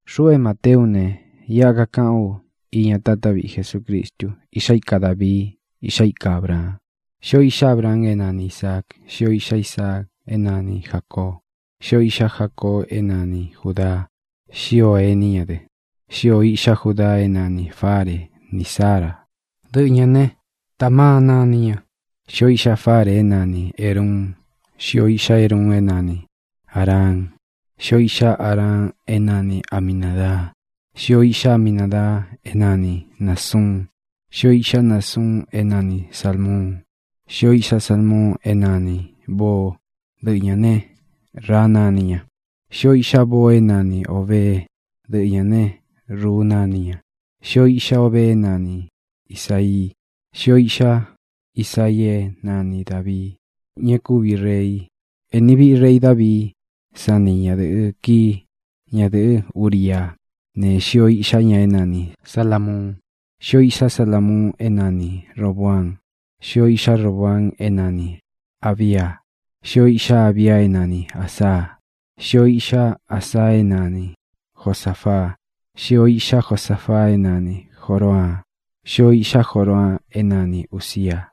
Xuꞌu é Mateú u ne, iꞌa kakaꞌán u iña táta viꞌi Jesucristu, iꞌxá ika Dāvii, iꞌxá ika Ābraan. Xíō iꞌxá Abraan é nani Īsaa; xíō iꞌxá Isaa é nani Jācoo; xíō iꞌxá Jacoo é nani Jūdaa; xíō ení ña dɨ. Xíō iꞌxá Judaa é nanī Fare ní Zara (dɨꞌɨ ñā ne, Tamaa nani ña); xíō iꞌxá Fare é nani Ēruun; xíō iꞌxá Eruun é nani Āraan; xíō iꞌxá Araan é nani Aminādaa; xíō iꞌxá Aminadaa é nani Nāsuun; xíō iꞌxá Nasuun é nani Sālmuun; xíō iꞌxá Salmuun é nanī Boó (dɨꞌɨ ñā né, Raa nani ña); xíō iꞌxá Boo é nani Ōbeé (dɨꞌɨ ñā né, Ruu nani ña); xíō iꞌxá Obee é nani Isāii; xíō iꞌxá Isaii é nani Dāvii, ña e kúvi rei. Ēni viꞌi rei Davií san ni ñadɨ̄ꞌɨ kií, ñadɨ̄ꞌɨ́ Uriá, ne, xíō iꞌxá ña é nani Salāmuun. Xíō iꞌxá Salamuun é nani Robōaan; xíō iꞌxá Roboaan é nani Ābia; xíō iꞌxá Abia é nanī Asa; xíō iꞌxá Asa é nani Josāfaa; xíō iꞌxá Josafaa é nani Jōraan; xíō iꞌxá Joraan é nani Ūzia;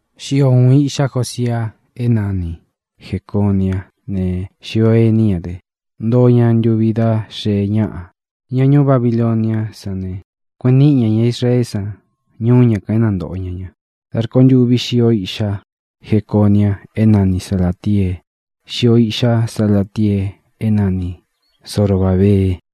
xío ūun iꞌxá Josia é nani Jecōniá ne, xíō ení ña dɨ. Ntoo ña ntuvi dá xee ñáꞌa, ña ñuú Babiloniá san ne, kueꞌen níꞌi ña ña Israeé san ñuú ña kān é nantōꞌo ña ña. Dā rkontûvi xíō iꞌxá Jeconia é nani Salātiee; xíō iꞌxá Salatiee é nani Zorobābee;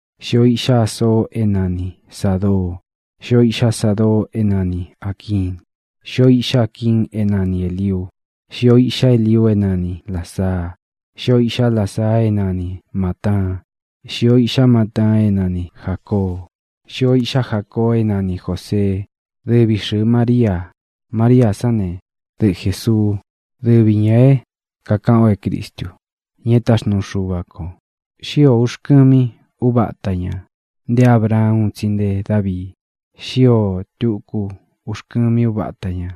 xíō iꞌxá Asoo é nani Sādoo; xíō iꞌxá Sadoo é nani Āquiin; xíō iꞌxá Aquiin é nani Elīuu; xíō iꞌxá Eliuu é nani Lāzaa; xíō iꞌxá Lazaa é nani Mātaan; xíō iꞌxá Mataan é nani Jācoo; xíō iꞌxá Jacoo é nani Jōseé, dɨvi xɨ̄ɨ Maríā. Maríā sán ne, dɨꞌɨ Jēsuú, dɨvi ñā é kākaꞌan o é Cristu, ña é taxnuu Xuva kō. Xío ūxkɨmi úvata ñā nté Abraan un tsi nté Davii. Xíō tuku uxkɨmi úvata ñā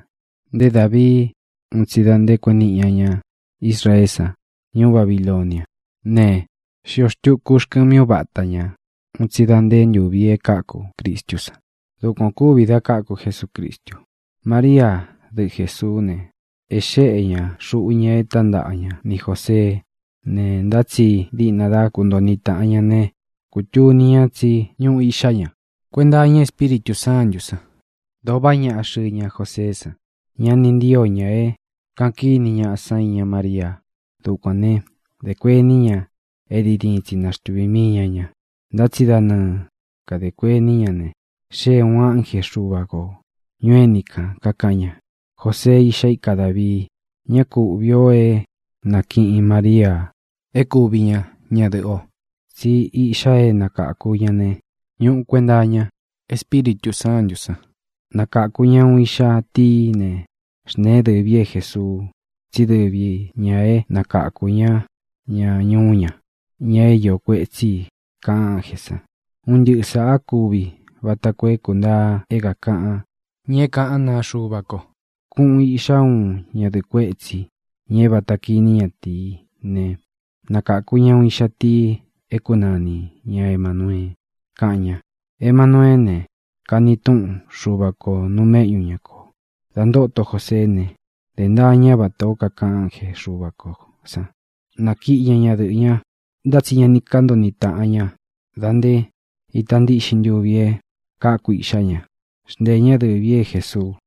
nté Davii un tsi da nté kueꞌen niꞌi ña ña Israeé san ñuú Babiloniá ne, xíō tuku uxkɨmi úvata ñā un tsi da nté ntūvi e káku Cristú san. Dukuan ō kúvi da káku Jesucristu: María, dɨꞌɨ Jēsuú ne, e xéꞌe ñā xuꞌu ña e tántaꞌa ña ni Jōseé ne, ntá tsi diꞌna dá kuntoo niꞌi tāꞌan ña ne, kūtuni ña tsí ñuꞌu iꞌxá ña kuenta iña Espíritū Sántū san. Dōo vaꞌá ñaꞌa xɨɨ ña Joseé san. Ña ni ntío ña é kāꞌan kíni ñaꞌa san iña Maríā. Dukuān né, dē kuení ña é diin diin tsi naxtuvī mii ña ña. Ntá tsi da nɨɨ kadē kuení ña ne, xée ūun ánje Xuva kō ñuu éni kān, kakaꞌan ña: —Jōsee, iꞌxá ika Dāvii, ñá ku uꞌvī o é nākiꞌin Maríā é kuvi ña ñadɨ̄ꞌɨ o, tsí iꞌxa é nakāku ña ne, ñuꞌu kuenta iña Espíritū Sántū san. Nakāku ña uun iꞌxa tií ne, xntēén dɨvī í é Jēsuu, tsí dɨvi ñā é nakakū ñá ña ñuú ña, ña é iō kuetsí i —kaꞌan ánjē san. Un ntɨꞌɨ sāꞌa kúvi vata koo é kūntaa é kākaꞌan ña é kaꞌán naa Xuva ko: Kuꞌun īꞌxá uun ñadɨ̄ꞌɨ kuétsī, ña é vāta kiní ñatīí ne, nakāku ña uun iꞌxa tii é kunani ña Emānuee, kaꞌan ña. Emanueé ne, kani túꞌun: Xuva kō nuu méꞌñu ña kō. Dā ntóto Joseé ne, dē ntaa ñá vatā ó kakaꞌan ánje Xuva kō san. Nākiꞌi ñá ñadɨꞌɨ̄ ña, ntá tsi ña ni kántoo niꞌi tāꞌan ña da nté ita ntíꞌxin ntuvi e káku iꞌxá ña. Xnteē ñá dɨvī í é Jēsuu.